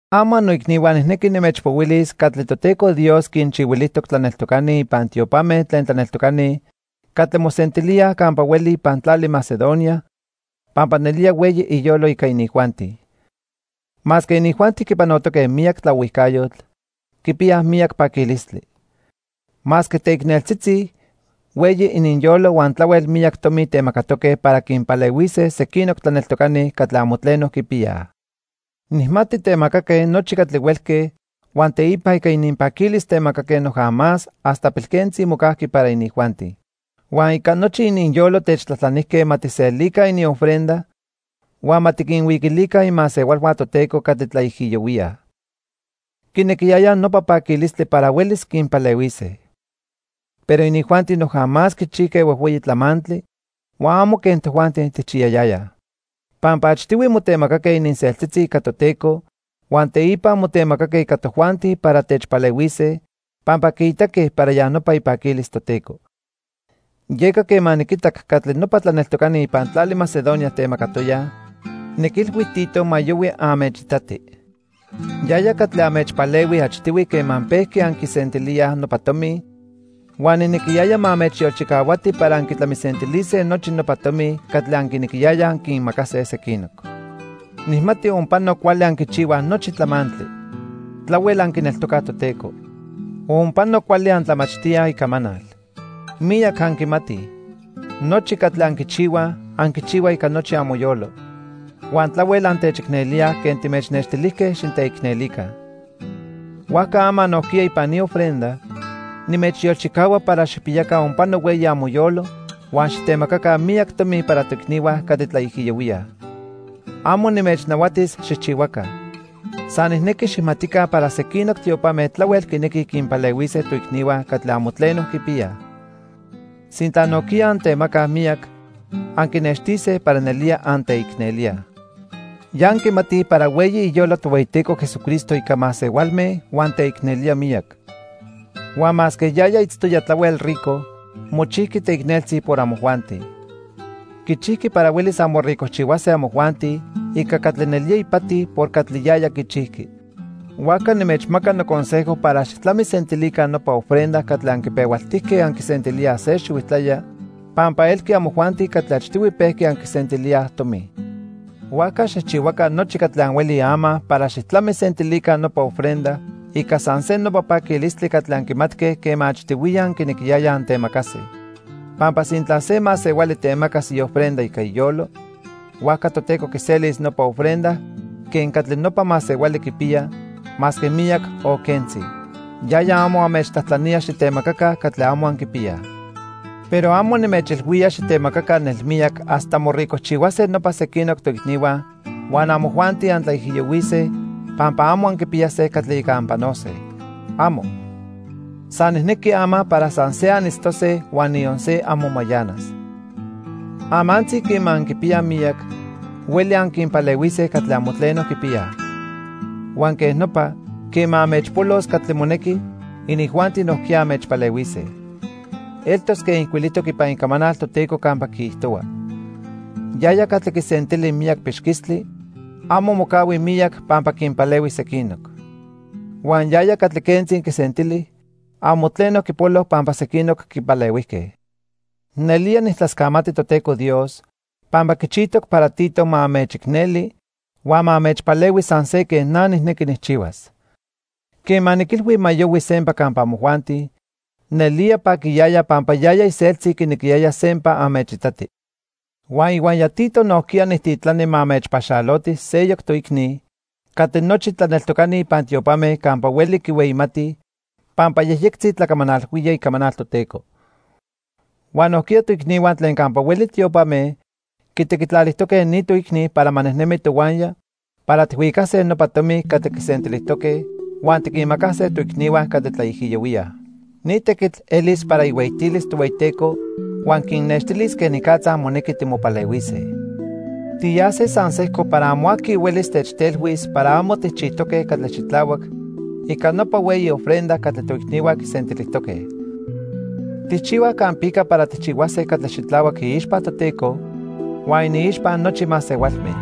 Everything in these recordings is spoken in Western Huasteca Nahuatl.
Ama noicnihua nijnequi nimechpohuilis catli Toteco Dios quinchihuilijtoc tlaneltocani ipan tiopame tlen tlaneltocani catli mosentilíaj campa hueli ipan tlali Macedonia, pampa nelía hueyi iyolo ica inijuanti. Masque inijuanti quipanotoque miyac tlaohuijcayotl, quipiyaj miyac paquilistli. Masque teicneltzitzi, hueyi ininyolo huan tlahuel miyac tomi temacatoque para quinpalehuise sequinoc tlaneltocani catli amo tleno quipiyaj. Nijmati temacaque nochi catli huelque huan teipa ica ininpaquilis temacaque noja más hasta pilquentzi mocajqui para inijuanti. Huan ica nochi ininyolo techtlajtlanijque ma tijselica iniofrenda huan ma tiquinhuiquilica imasehualhua Toteco catli tlaijiyohuíaj. Quinequiyayaj nopa paquilistli para huelis quinpalehuise. Pero inijuanti noja más quichijque huejhueyi tlamantli huan amo quen tojuanti tijchiyayayaj. Pampa achtihui motemacaque ininseltzitzi ica Toteco huan teipa motemacaque ica tojuanti para techpalehuise pampa quiitaque para ya nopa ipaquilis Toteco. Yeca quema niquitac catli nopa tlaneltocani ipan tlali Macedonia temacatoyaj, niquilhui Tito ma yohui anmechitati. Yaya catli anmechpalehui achtihui quema pejqui anquisentilíaj nopa tomi huan nijnequiyaya ma anmechyolchicahuati para anquitlamisentilise nochi nopa tomi catli anquinequiyayaj anquinmacase sequinoc. Nijmati onpano cuali anquichihuaj nochi tlamantli. Tlahuel anquineltocaj Toteco. Onpano cuali antlamachtíaj Icamanal. Miyac anquimatij. Nochi catli anquichihuaj, anquichihuaj ica nochi amoyolo. Huan tlahuel antechicnelíaj quen timechnextilijque xiteicnelica. Huajca ama nojquiya ipan ni ofrenda, nimechyolchicahua para xijpiyaca onpano hueyi amoyolo huan xitemacaca miyac tomi para toicnihua catli tlaijiyohuíaj. Amo nimechnahuatis xijchihuaca. San nijnequi xijmatica para sequinoc tiopame tlahuel quinequij quinpalehuise toicnihua catli amo tleno quipiyaj. Sintla nojquiya antemacaj miyac, anquinextise para nelía anteicnelíaj. Ya anquimatij para hueyi iyolo Tohueyiteco Jesucristo ica masehualme huan teicnelía miyac. Huan masque yaya itztoya tlahuel rico, mochijqui teicneltzi por amojuanti. Quichijqui para huelis anmoricojchihuase amojuanti ica catli nelía ipati por catli yaya quichijqui. Huajca nimechmaca noconsejo para xijtlamisentilica nopa ofrenda catli anquipehualtijque anquisentilíaj se xihuijtlaya, pampa elqui amojuanti catli achtihui pejqui anquisentilíaj tomi. Huajca xijchihuaca nochi catli anhuelij ama para xijtlamisentilica nopa ofrenda ica san se nopa paquilistli catli anquimatque quema achtihuiya anquinequiyayaj antemacase. Pampa sintla se masehuali temacas iofrenda ica iyolo, huajca Toteco quiselis nopa ofrenda quen catli nopa masehuali quipiya, masque miyac o quentzi. Yaya amo anmechtlajtlanía xitemacaca catli amo anquipiyaj. Pero amo nimechilhuía xitemacaca nelmiyac hasta moricojchihuase nopa sequinoc toicnihua huan amojuanti antlaijiyohuise pampa amo anquipiyase catli ica anpanose. ¡Amo! San nijnequi ama para san se anitztose huan niyon se amo mayanas. Amantzi quema anquipiyaj miyac, hueli anquinpalehuise catli amo tleno quipiyaj. Huan quej nopa, quema anmechpolos catli monequi, inijuanti nojquiya anmechpalehuise. Eltos quen ijcuilijtoc ipan Icamanal Toteco campa quiijtohua: "Yaya catli quisentili miyac pixquistli, amo mocahui miyac pampa quinpalehui sequinoc. Huan yaya catli quentzi quisentili, amo tleno quipolo pampa sequinoc quipalehuijque." Nelía nijtlascamati Toteco Dios, pampa quichijtoc para Tito ma anmechicneli huan ma anmechpalehui san se quen na nijnequi nijchihuas. Quema niquilhui ma yohui sempa campa amojuanti, nelía paquiyaya pampa yaya iseltzi quinequiyaya sempa anmechitati. Huan ihuaya Tito nojquiya nijtitlani ma anmechpaxaloti seyoc toicni catli nochi tlaneltocani ipan tiopame campa hueli quihueyimatij pampa yejyectzi tlacamanalhuía icamanal Toteco. Huan nojquiya toicnihua tlen campa hueli tiopame quitequitlalijtoque ni toicni para ma nejnemi tohuaya para tijhuicase nopa tomi catli quisentilijtoque huan tiquinmacase toicnihua catli tlaijiyohuíaj. Ni tequitl elis para ihueyitilis Tohueyiteco huan quinnextilis quenicatza monequi timopalehuise. Tiyase san sejco para amo aqui huelis techtelhuis para amo tijchijtoque catli xitlahuac ica nopa hueyi ofrenda catli toicnihua quisentilijtoque. Tijchihuaj campica para tijchihuase catli xitlahuac iixpa Toteco huan iniixpa nochi masehualme.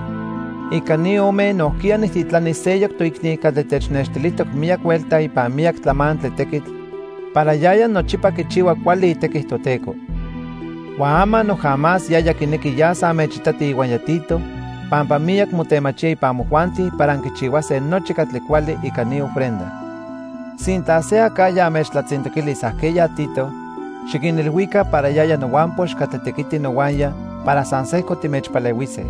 Ica ni ome nojquiya nijtitlani seyoc toicni catli technextilijtoc miyac huelta ipan miyac tlamantli tequitl para yaya nochipa quichihua cuali itequi Toteco. Huan ama noja más yaya quinequi yas anmechitati ihuaya Tito pampa miyac motemachía ipan amojuanti para anquichihuase nochi catli cuali ica ni ofrenda. Sintla se acajya anmechtlatzintoquilis ajqueya Tito, xiquinilhuica para yaya nohuampox catli tequiti nohuaya para san sejco timechpalehuise.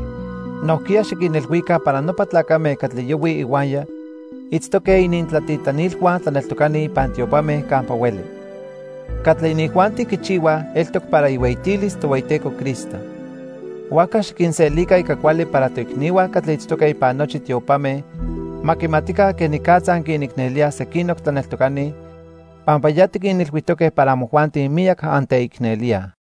Nojquiya xiquinilhuica para nopa tlacame catli yohuij ihuaya itztoque inintlatitlanilhua tlaneltocani ipan tiopame campa hueli. Catli inijuanti quichihuaj eltoc para ihueyitilis Tohueyiteco Cristo. Huajca xiquinselica ica cuali para toicnihua catli itztoque ipan nochi tiopame ma quimatica quenicatza anquinicnelíaj sequinoc tlaneltocani, pampa ya tiquinilhuijtoque para amojuanti miyac anteicnelíaj.